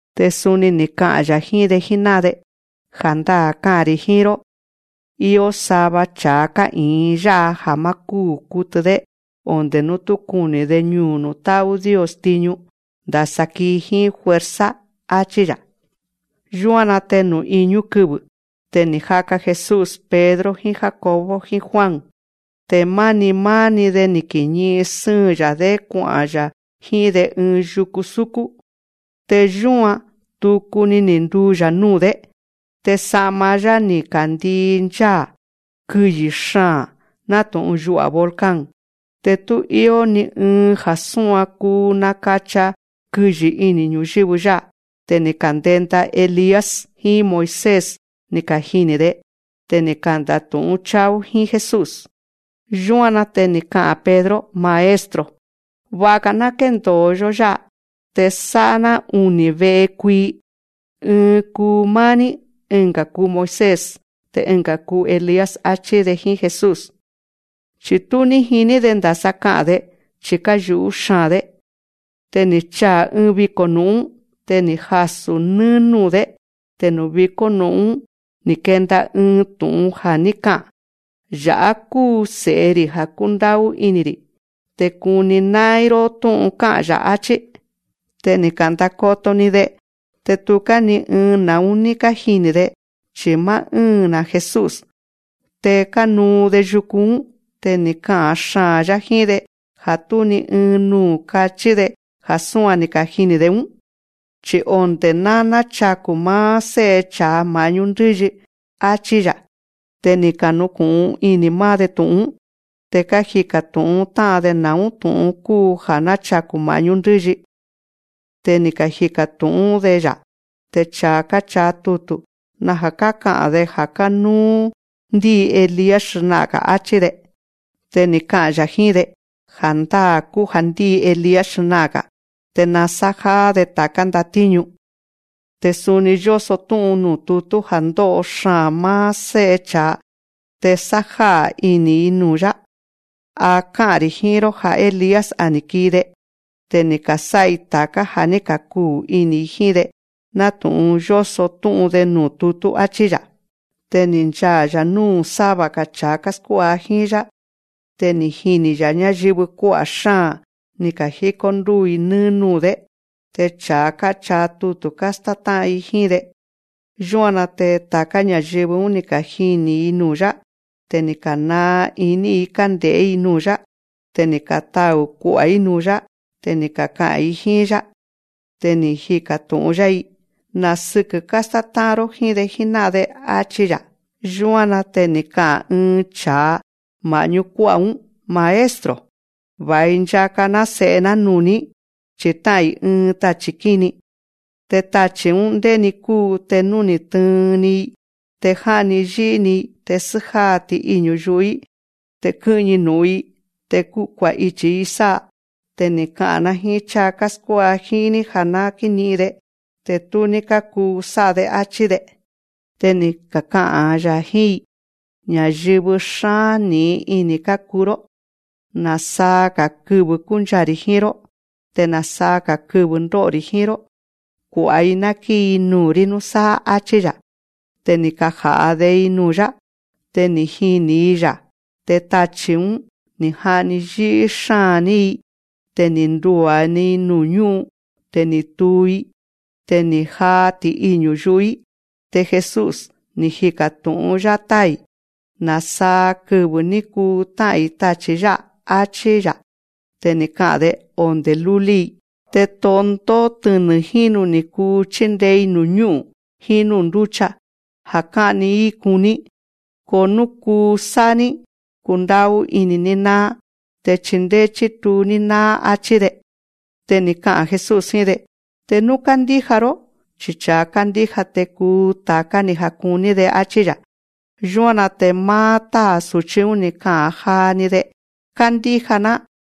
Te suni ni̱ ka'a̱n‑ya̱ jíín‑de jíná'an‑de: Ja̱ndáa̱ ká'a̱n‑ri̱ jíín‑ró: Ió sava cha̱a ká'i̱in yá'a ja̱ má kúu̱ kutɨ‑dé onde̱ nú tú kuni̱‑de ñuu̱ nuu̱ tá'ú Dios tiñu, ndasa kii jíín fuerza, áchí‑ya̱. Yúan‑na te nuu̱ iñú kɨvɨ̱ te ni̱ jaka Jesús Pedro jíín Jacobo jíín Juan, te máni máá‑ni‑de ni̱ kiñi'in sɨ́ɨn‑ya̱‑dé kua'a̱n‑ya̱ jíín‑de ɨɨn yuku súkún. Te yúan, tuku ni̱ nduu‑ya̱ núu̱‑dé. Te sa'ma‑yá ni̱ ka̱nandii ncháa̱, kɨyi̱ xaa̱n, nátu̱'un yu'a̱ volcán. Te tú íó ni ɨɨn ja̱ súan kuu nakacha kɨyi̱ ini̱ ñu̱yɨ́vɨ yá'a. Te ni̱ ka̱ndenda Elías jíín Moisés ni̱ kajini̱‑de. Te ni̱ kanda̱tu̱'ún cháa‑ún jíín Jesús. Yúan‑na te ni̱ ka'a̱n Pedro: Maestro, va̱'a‑ga̱ ná kéndo̱o‑yó yá'a, te sá'a‑ná uni̱ ve'e kuii. Ɨɨn kuu máá‑ní, ɨnga̱ kuu Moisés, te ɨnga̱ kuu Elías, áchí‑de jíín Jesús. Chi̱ tú ní jiní‑de ndasa ka'a̱n‑de, chi̱ káyu̱'ú xáa̱n‑dé. Te ni̱ chaa̱ ɨɨn viko̱ nu̱'ún. Te ni̱ jasu̱ nɨ́ɨ́ núu̱‑dé. Te nuu̱ vikó nu̱'ún‑ún ni̱ kenda ɨɨn tu̱'un ja̱ ní ka'a̱n: Ya̱'á kúu Se̱'e‑ri̱ ja̱ kúndá'ú ini̱‑ri̱, te kuni ná'ín‑ró tú'un ká'a̱n‑ya̱. Achí. Te ni̱ ka̱ndakoto‑ni‑de. Te tuká ni ɨɨn na̱ún ní kájini̱‑de, chi̱ máá ɨ́ɨn‑na̱ Jesús. Te kánuu‑de yuku‑ún, te ni̱ ka'a̱n xaa̱n‑yá jíín‑de ja̱ tú ni ɨɨn nuu̱ kachí‑de ja̱ súan ni̱ kajini̱‑de‑ún, chi̱ onde̱ ná náchaku̱ máá Sé'e cha̱a ma̱'ñú ndɨ́yi. Achí‑ya̱. Te ni̱ kañu̱'un ini̱ máá‑de tu̱'un‑ún. Te kájika̱ tu̱'ún tá'an‑de na̱ún tu̱'un kúu: Ja̱ náchaku̱ ma̱'ñú ndɨ́yi. Te ni̱ kajika̱ tu̱'ún‑de‑ya̱: Te cha̱a káchaa tutu̱ naja̱ káka'a̱n‑de ja̱ kánúú ndíi Elías xna'a̱n‑ga̱, áchí‑de. Te ni̱ ka'a̱n‑ya̱ jíín‑de: Ja̱ndáa̱ kúu ja̱ ndíi Elías xna'a̱n‑ga̱, te nasájáá‑de ta̱ká ndatíñu. Te suni yóso tú'un nuu̱ tutú ja̱ ndó'o xaa̱n máá Sé'e cha̱a te sájá'a̱ ini̱‑i nuu̱‑yá. A ká'a̱n‑ri̱ jíín‑ró ja̱ Elías, a ni̱ kii‑de. Te ni̱ ka̱sá'a‑i ta̱ká ja̱ ní ka̱kuu ini̱‑i jíín‑de, nátu̱'un yóso tú'un‑de nuu̱ tutú, áchí‑ya̱. Te ni̱ nchaa̱‑ya̱ núu̱ sáva‑ga̱ cha̱a káskuá'a jíín‑yá. Te ni̱ jini̱‑ya̱ ñáyɨvɨ kuá'a̱ xáa̱n, ni̱ ka̱jíkó ndúu̱‑i nɨ́ɨ́ núu̱‑dé. Te cha̱a káchaa tutu̱ kástátá'an jíín‑de. Yúan‑na te ta̱ká ña̱yɨvɨ‑ún, ni̱ kajini̱‑ni‑i nuu̱‑yá. Te ni̱ ka̱naa iní‑i kánde̱'é‑i nuu̱‑yá. Te ni̱ katau̱‑i kua'a̱n‑i nuu̱‑yá. Te ni̱ kaka'a̱n‑i jíín‑yá. Te ni̱ jika̱ tu̱'ún‑yá‑i: Na̱ sɨkɨ̱ kástátá'an‑ró jíín‑de jíná'an‑de, áchí‑ya̱. Yúan‑na te ni̱ ka'a̱n ɨɨn cha̱a ma̱'ñú ñáyɨvɨ kuá'a̱‑ún: Maestro, va̱i nchaka‑ná se̱'e‑ná nuu̱‑ní, chi̱ tá'a̱n‑i ɨɨn tachi̱ ñí'ín. Te tachi̱‑ún, ndéni kúu te nú ni̱ tɨɨn‑ni‑i, te já'ni yí'í‑ni‑i. Te sjáa‑ni ti'iñu̱ yu'u‑í. Te skɨ́'ñi nu̱'un‑i. Te kua̱'ichi̱‑i sá'a. Te ni̱ ka'a̱n‑ná jíín cháa káskuá'a jíín‑ní ja̱ ná kíñi'in‑de ki'i̱n. Te tú ní kákuu sá'a‑de, áchí‑de. Te ni̱ ka'a̱n‑ya̱ jíín‑i: Ña̱yɨvɨ xáa̱n ní'in ini̱ kákuu‑ró. Na̱saa‑ga̱ kɨvɨ kúnchaa̱‑ri̱ jíín‑ró. Te na̱saa‑ga̱ kɨvɨ̱ ndó'o‑ri̱ jíín‑ró. Kua̱'a‑i ná kíi‑i nuu̱‑rí núsáá, áchí‑ya̱. Te ni̱ kaja̱'a‑de‑i nuu̱‑yá. Te ni̱ jini̱‑i‑ya̱. Te tachi̱‑ún, ni̱ ja'ni yí'í xáa̱n‑ní‑i. Te ni̱ ndua̱‑i nuu̱ ñú'un. Te ni̱ tuu‑í. Te ni̱ jaa ti'iñu̱ yu'u‑í. Te Jesús, ni̱ jika̱ tu̱'ún‑yá táa̱‑i: Na̱saa kɨvɨ̱ ní kuu tá'a̱n‑i tachi̱ yá'a, áchí‑ya̱. Te ni̱ ka'a̱n‑de: Onde̱ lúlí‑i. Te tondó tɨnɨ̱ jínu ni̱ kuu chíndee‑i nuu̱ ñú'u̱n jíín núu̱ ndúcha, ja̱ ká'ni‑í kuní. Ko nú kuu sá'a‑ní, kundá'ú ini̱‑ní náá. Te chindéé chítuu‑ní náá, áchí‑de. Te ni̱ ka'a̱n Jesús jíín‑de: Te nú kándíja‑ró, chi cha̱a kándíja te kuu ta̱ká ja̱ kuní‑de, áchí‑ya̱. Yúan‑na te máá táa̱ su̱chí‑ún, ni̱ ka'a̱n jaa‑ni‑de: Kándíja‑ná,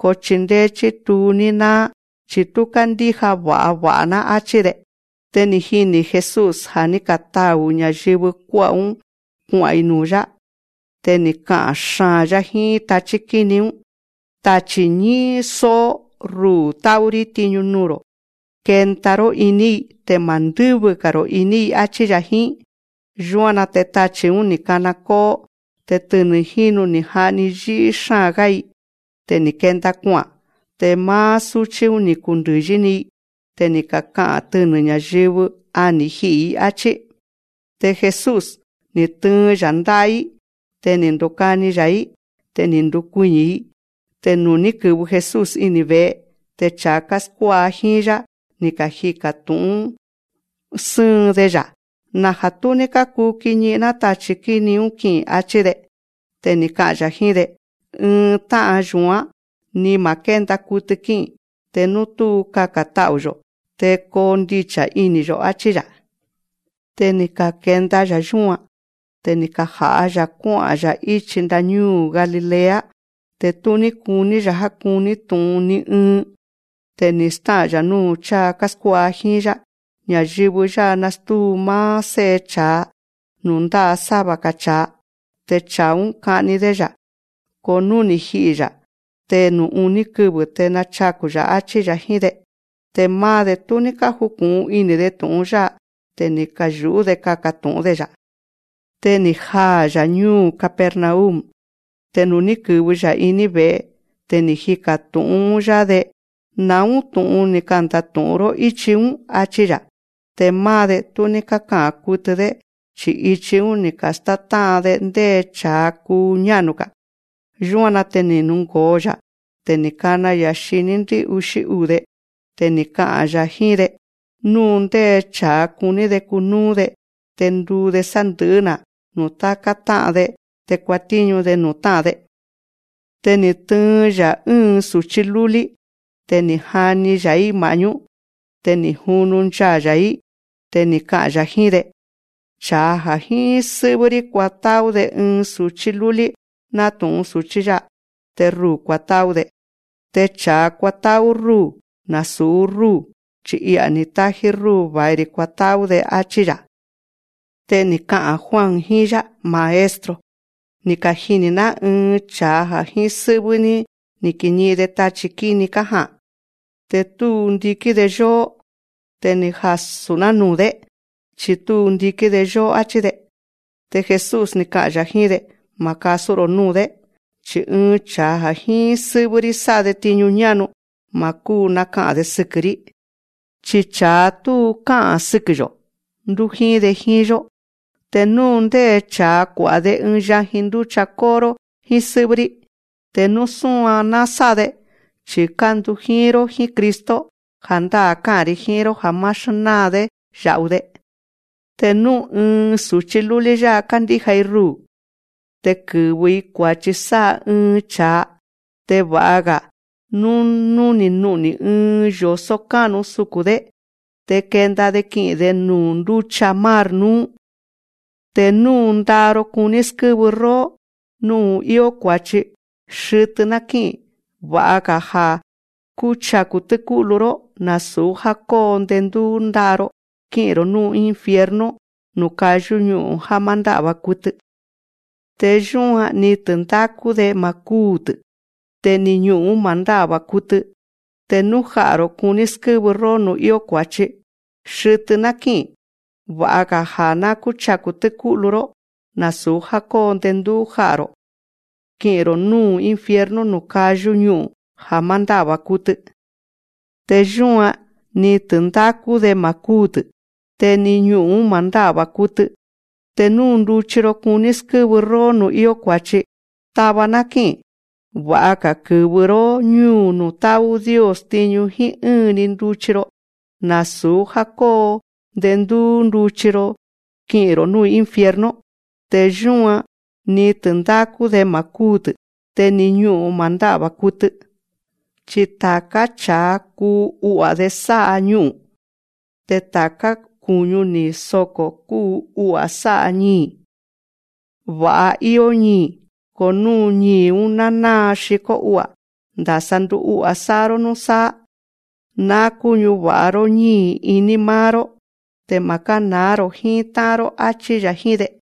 ko chindéé chítuu‑ní náá chi̱ tú kándíja va̱'a va̱'a‑ná, áchí‑de. Te ni̱ jini̱ Jesús ja̱ ní katau̱ ña̱yɨvɨ kuá'a̱‑ún kua'a̱n‑i nuu̱‑yá. Te ni̱ ka'a̱n xaa̱n‑yá jíín tachí kíni‑ún: Tachi̱ ñí'ín só'ó, ruu̱ tá'ú‑rí tiñu nuu̱‑ro̱. Kenda‑ró iní‑i, te ma̱ ndɨ́vɨ‑ga̱‑ro̱ iní‑i, áchí‑ya̱ jíín. Yúan‑na te tachi̱‑ún, ni̱ kana kó'ó. Te tɨnɨ̱ jínu ni̱ ja'ni yí'í xáa̱n‑gá‑i. Te ni̱ kenda kua'a̱n. Te máá súchí‑ún, ni̱ kundɨ̱yi‑ni‑i. Te ni̱ kaka'a̱n tɨnɨ̱ ña̱yɨvɨ: A ni̱ ji'i̱‑i, áchí. Te Jesús, ni̱ tɨɨn‑ya̱ ndá'a‑í, te ni̱ ndukani‑ya̱‑í. Te ni̱ ndukuiñi̱‑i. Te nuu̱ ní kɨ̱vɨ Jesús ini̱ ve̱'e, te cha̱a káskuá'a jíín‑yá, ni̱ kajika̱ tu̱'ún sɨ́ɨn‑de‑ya̱: Naja̱ tú ní kákuu kiñi'in‑ná tachi̱‑ún ki'i̱n, áchí‑de. Te ni̱ ka'a̱n‑ya̱ jíín‑de: Ɨɨn tá'an yu̱án, ni ma̱ kénda kutɨ kí'i̱n, te nú tú kaka̱n ta'u̱‑yo̱ te kondicha̱ ini̱‑yo̱, áchí‑ya̱. Te ni̱ ka̱kenda‑ya̱ yúan. Te ni̱ kaja̱'a‑ya̱ kuá'a̱n‑ya̱ íchi ndáñúu̱ Galilea. Te tú ní kuní‑ya̱ já kúni tu̱'un ni ɨɨn. Te ni̱ stá'a̱n‑ya̱ núu̱ cháa káskuá'a jíín‑yá: Ña̱yɨvɨ yá'a nastúu‑i máá Sé'e cha̱a nuu̱ ndá'a sáva‑ga̱ cha̱a. Te cha̱a‑ún, ka'ni‑dé‑ya̱. Ko nú ni̱ ji'i̱‑ya̱, te nuu̱ uní kɨvɨ̱ te nachaku̱‑ya̱, áchí‑ya̱ jíín‑de. Te máá‑de, tú ní kájuku̱'un ini̱‑de tu̱'un yá'a. Te ni̱ kayu̱'ú‑de kaka̱ tu̱'ún‑de‑ya̱. Te ni̱ jaa̱‑ya̱ ñúu̱ Capernaum. Te nuu̱ ní kɨ̱vɨ‑ya̱ iní ve̱'e, te ni̱ jika̱ tu̱'ún‑yá‑de: Na̱ún tu̱'un ni̱ kanda̱tu̱'ún‑ró íchi‑ún, áchí‑ya̱. Te máá‑de, tú ní káka'a̱n kutɨ‑dé. Chi̱ ichi‑ún ni̱ ka̱státá'an‑de ndé cha̱a kuu ñá'nu‑ga̱. Yúan‑na te ni̱ jungo̱o‑ya̱. Te ni̱ kana‑ya̱ xiní ndɨ́'uxí uu̱‑de. Te ni̱ ka'a̱n‑ya̱ jíín‑de: Nú ndé cha̱a kuní‑de kunúú‑de, te nduu‑de sandɨ̱'ɨ́‑na̱ nuu̱ táká tá'an‑de. Te kuatíñu‑de nuu̱ tá'an‑de. Te ni̱ tɨɨn‑ya̱ ɨ́ɨn su̱chí lúlí. Te ni̱ jani‑ya̱‑í ma̱'ñú‑de. Te ni̱ junu nchaa̱‑ya̱‑í. Te ni̱ ka'a̱n‑ya̱ jíín‑de: Cha̱a ja̱ jíín sɨ́'vɨ́‑rí kuatá'ú‑de ɨɨn su̱chí lúlí nátu̱'un su̱chí yá'a, te ruu̱ kuatá'ú‑de. Te cha̱a kuatá'ú rúu̱, nasu̱ rúu̱, chi̱ I'a̱ ni̱ tájí rúu̱ va̱i‑ri̱ kuatá'ú‑de, áchí‑ya̱. Te ni̱ ka'a̱n Juan jíín‑yá: Maestro, ni̱ kajini̱‑ná ɨɨn cha̱a ja̱ jíín sɨ́'vɨ́‑ní ni̱ kiñi'in‑de tachi̱ kíni kája'a̱n. Te tú ndikín‑de yóó. Te ni̱ kajasu̱‑ná nuu̱‑dé. Chi̱ tú ndikín‑de yóó, áchí‑de. Te Jesús, ni̱ ka'a̱n‑ya̱ jíín‑de: Ma̱ kasú‑ro̱ núu̱‑dé, chi̱ ɨɨn cha̱a ja̱ jíín sɨ́'vɨ́‑rí sá'a‑de tiñu ñá'nu, ma̱ kúu naka'a̱n‑de sɨkɨ̱‑rí. Chi cha̱a tú ká'a̱n sɨkɨ̱‑yo̱, ndújíín‑de jíín‑yó. Te nú ndé cha̱a kua̱'a‑de ɨɨn yajin ndúcha kó'o‑ró jíín sɨ́'vɨ́‑rí, te nú súan ná sá'a‑de chi̱ kándujíín‑ró jíín Cristo, ja̱ndáa̱ ká'a̱n‑ri̱ jíín‑ró ja̱ má xnáa‑dé ya̱'u‑de. Te nú ɨɨn su̱chí lúlí yá'a kándíja‑i ruu̱ te kɨ̱vɨ‑i kua̱chi sá'a ɨɨn cha̱a, te va'a̱‑ga̱ nú ní nú'ni̱ ɨɨn yo̱só ká'nu suku̱n‑dé, te kenda‑de ki'i̱n‑de nuu̱ ndúcha mar núú. Te nú nda'a‑ro kuní skɨ́vɨ róó nuu̱ íó kua̱chi, xɨtɨ ná kí'i̱n. Va'a̱‑ga̱ ja̱ kúchaku̱ tɨ́kú'lu‑ró, nasu̱ já kóo ndendúú nda'a‑ro kí'i̱n‑ro̱ núu̱ infierno, nuu̱ kayú ñu'u̱n ja̱ má ndá'va̱ kutɨ. Te yúan, ni tɨ̱ndákú‑de ma̱ kúu̱‑tɨ̱. Te ni ñu'u̱n‑ún ma̱ ndá'va̱ kutɨ. Te nú ja'a̱‑ro̱ kuní skɨ́vɨ róó nuu̱ íó kua̱chi, xɨtɨ ná kí'i̱n. Va'a̱‑ga̱ ja̱ kúchaku̱ tɨ́kú'lu‑ró, nasu̱ já kóo ndendúú ja'a̱‑ro̱ kí'i̱n‑ro̱ núu̱ infierno, nuu̱ kayú ñu'u̱n ja̱ má ndá'va̱ kutɨ. Te yúan, ni tɨ̱ndákú‑de ma̱ kúu̱‑tɨ̱. Te ni ñu'u̱n‑ún ma̱ ndá'va̱ kutɨ. Te nú nduchi‑ro kuní skɨ́vɨ róó nuu̱ íó kua̱chi, tava ná kí'i̱n. Va'a̱‑ga̱ kɨ́vɨ‑ró ñúu̱ nuu̱ tá'ú Dios tiñu jíín ɨ́ɨn‑ni nduchi‑ro, nasu̱ já kóo ndendúú nduchi‑ro kí'i̱n‑ro̱ núu̱ infierno. Te yúan, ni tɨ̱ndákú‑de ma̱ kúu̱‑tɨ̱. Te ni ñu'u̱n‑ún ma̱ ndá'va̱ kutɨ. Chi ta̱ká cha̱a kuu u'a̱‑de sá'a ñu'u̱n. Te ta̱ká ku̱ñu ni̱ soko̱, kuu u'a̱ sá'a ñii̱. Va̱'a íó ñii̱. Ko nú ñii̱‑ún ná náa xikó u'a̱, ndasa ndu'u'a̱ sá'a‑ró núsáá. Ná kúñava̱'a‑ró ñíi̱ iní máá‑ró. Te ma̱ kána̱á‑ro̱ jíín tá'an‑ró, áchí‑ya̱ jíín‑de.